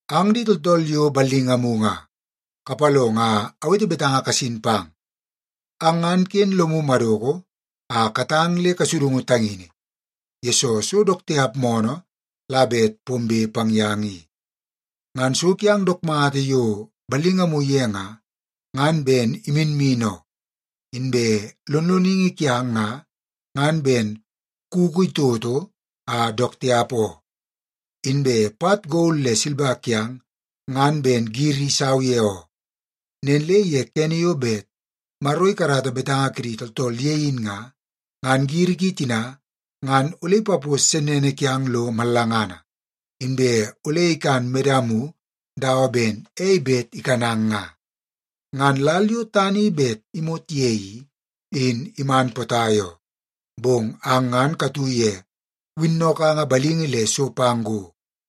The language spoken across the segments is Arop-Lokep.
Ang di tooltool yo ballingamu nga, kapalongo a awete betanga kasin pang. Ang ngan ken lomu madoko a katang le kasudungu tangini, yesoo so dook tiap moonoo la bet pombe pang yang i. Ngan so kiang dook mata yo ballingamu ye nga, ngan ben iminmin oo, inbe lonloningi kiang nga, ngan ben kuku itoto a dook tiap oo. Inbe pat gol le silba kiang ngan ben giri isau ye oo. Nen le ye kene yo bet Maro ikarata betanga kidi tooltool ye in nga, ngan giri ki tina ngan ole ipapos sennene kiang lo mallangana, inbe ole ikan medamu dawa ben ei bet ikanang nga. Ngan lal yo tana i bet imot ye i, in iman potai oo, bong ang ngan katu ye winnokanga balingi le so pang go.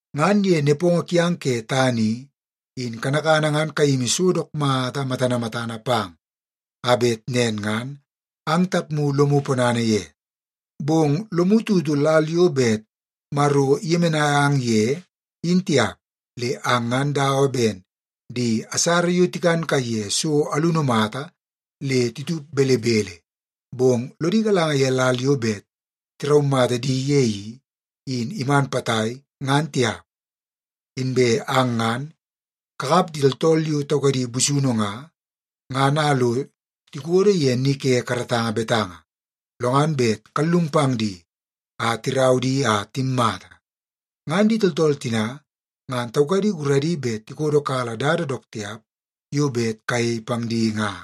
Ngan ye nepongo kiang ke tana i, in kanakana ngan kayimi so dook mata matana matana pang a bet nen ngan ang tapmu lomu ponana ye, bong lomu tutu lal yo bet Maro iyemenai ang ye, in tiap. Le ang ngan dawa ben di asara yo tikan kaiye so alunu mata le titup belebele, bong lodi galanga ye lal yo bet tiraumata di ye i, in iman potai, ngan tiap. Inbe ang ngan kakap di tooltool yo taukadi busunu nga, ngan a lo tikodo ye ni ke karatanga betanga, lo ngan bet kallung pang di a tirau di a timmata. Ngan di tooltool tina ngan taukadi guradi bet tikodokala dada dook tiap yo bet kayei pang di nga.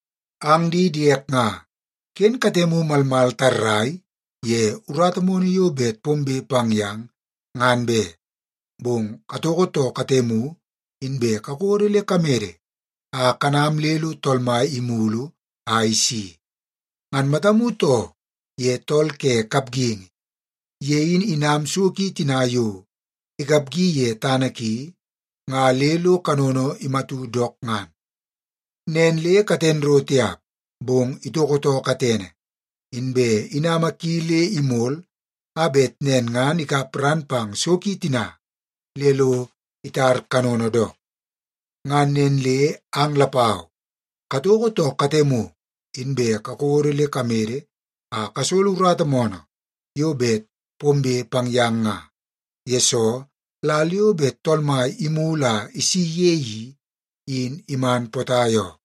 Ang di diek nga, ken katemu malmal tarrai ye urata moonoo yo bet pombe pang yang ngan be, bong katoko too katemu inbe kakodo le kamede a kanam le lo Tool Mai imulu a isi. Ngan matamu too ye tool ke kapgingi. Ye in inam so ki tina yo ikapgi ye tana ki nga le lo kanono imatu dook ngan. Nen le katen ro tiap, bong itoko too katene, inbe inama ki le imol a bet nen ngan ikap ran pang so tina le lo itar kanono dook. Ngan nen le ang lapau katoko too katemu, inbe kakodo le kamede a kasolo urata moonoo yo bet pombe pang yang nga, yesoo lal yo bet Tool Mai imulu a isi ye i, in iman potai oo.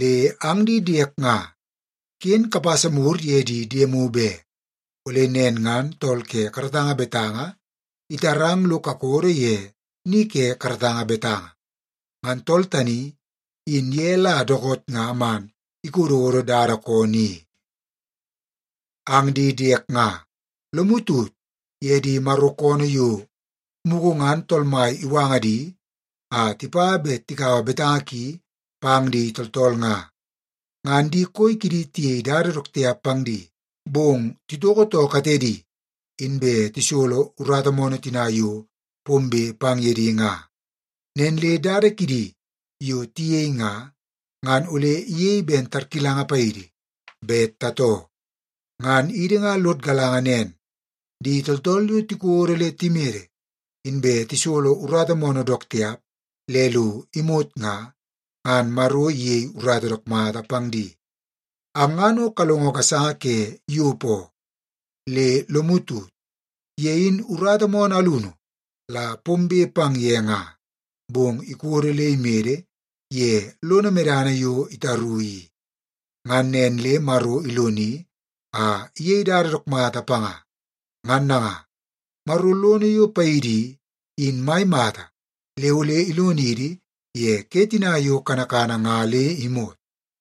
Le ang di diek nga, ken kapasa mur ye di diemu be. Ole nen ngan tool ke karatanga betanga itarang lo kakodo ye ni ke karatanga betanga. Ngan tool tani in ye la dookoot nga man ikododo dada koonoo i. Ang di diek nga, lomu tut ye di Maro koonoo yo mugu ngan Tool Mai iwanga di a tipa bet tikaua betanga ki pang di tooltool nga. Ngan di koi kidi tiyei dada dook tiap pang di, bong titoko too katedi, inbe tisolo urata moonoo tina yo pombe pang ye di nga. Nen le dada kidi yo tiyei nga, ngan ole iyei ben tarkilanga paidi bet tatoo. Ngan idi nga lod galanga nen, di tooltool yo tikodo le timede inbe tisolo urata moonoo dook tiap le lo imot nga, ngan Maro iyei urata dook mata pang di. Ang ngan o kalongo gasanga ke Yop oo. Le lomu tut, ye in urata moonoo alunu la pombe pang ye nga, bong ikodo le imede ye lono medana yo itaru i. Ngan nen le Maro iloni a iyei dada dook mata panga. Ngan nanga, Maro lono yo paidi i, in mai mata le ole ilonidi ye ke tina yo kanakana nga le imot.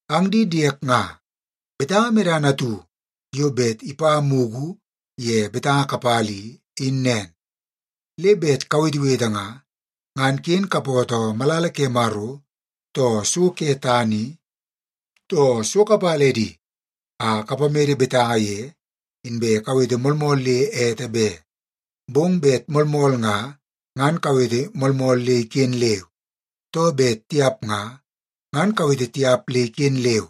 Ang di diek nga, betanga medana atu yo bet ipa mugu ye betanga kapala i, in nen. Le bet kawetewete nga, ngan ken kapootoo malala ke Maro, too so ke tana i, too so kapala edi a kapamede betanga ye, inbe kawete moolmool le ete be. Bong bet moolmool nga, ngan kawete moolmool le iken leu. Too bet tiap nga, ngan kawete tiap le iken leu.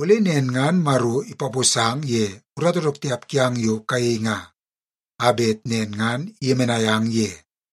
Ole nen ngan Maro ipaposang ye urata dook tiap kiang yo kayei nga, a bet nen ngan iyemenai ang ye.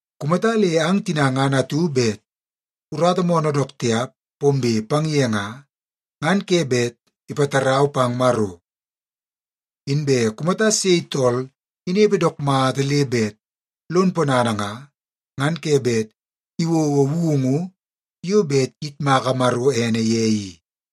Kumata le ang tina ngan atu bet urata moonoo dook tiap pombe pang ye nga, ngan ke bet ipatarau pang Maro. Inbe kumata sei tool inepe dook mata le bet lon ponana nga, ngan ke bet iwouwou woungu yo bet iyitmaka Maro ene ye i.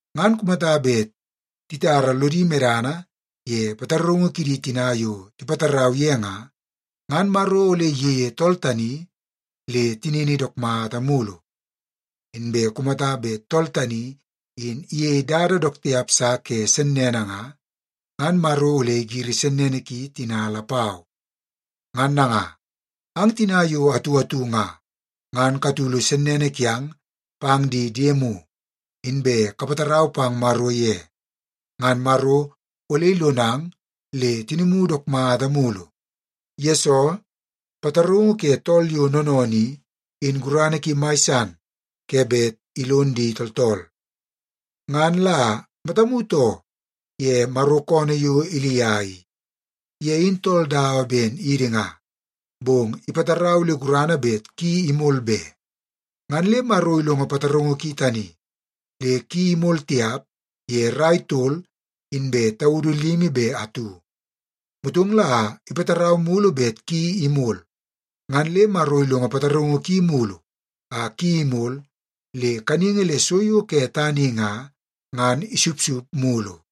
Ngan kumata bet titara lodi medana ye pataraungu kidi tina yo tipatarau ye nga, ngan Maro ole iyeie tool tani le tinini dook mata mulu. Inbe kumata bet tool tani in iyei dada dook tiap sa ke sennene nga, ngan Maro ole igiri sennene ki tina lapau. Ngan nanga, ang tina yo atu atu nga, ngan katulu sennene kiang pang di diemu, inbe kapatarau pang Maro ye. Ngan Maro ole ilonang le tinimu dook mata mulu. Yesoo, pataraungu ke tool yo noonoonoo i, in gurana ki mai san ke bet ilon di tooltool. Ngan la matamu too ye Maro koonoo yo Ilia i. Ye in tool dawa ben idi nga, bong ipatarau le gurana bet ki imol be. Ngan le Maro ilongo pataraungu ki tani le ki imol tiap ye rai tol inbe taudu limi be atu. Motong la ipatarau mulu bet ki imol, ngan le Maro ilongo pataraungu ki mulu a ki imol le kaningi le so yo ke tana i nga, ngan isupsup mulu.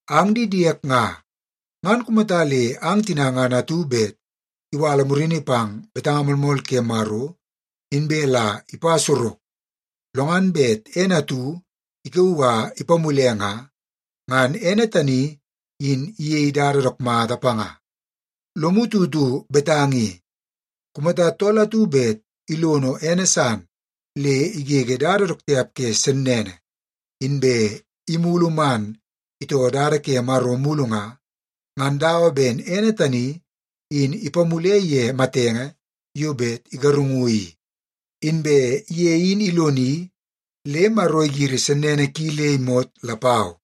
Ang di diek nga, ngan kumata le ang tina ngan atu bet iwala murini pang betanga moolmool ke Maro, inbe la ipa sorok, lo ngan bet ene atu ikauu a ipamule nga, ngan ene tani in iyei dada dook mata panga. Lomu tutu betanga i: Kumata tool atu bet ilono ene san le igege dada dook tiap ke sennene, inbe imulu man itoo dada ke Maro mulu nga, ngan dawa ben ene tani in ipamule ye matenge yo bet igarungu i, inbe ye in iloni le Maro igiri sennene ki le imot lapau.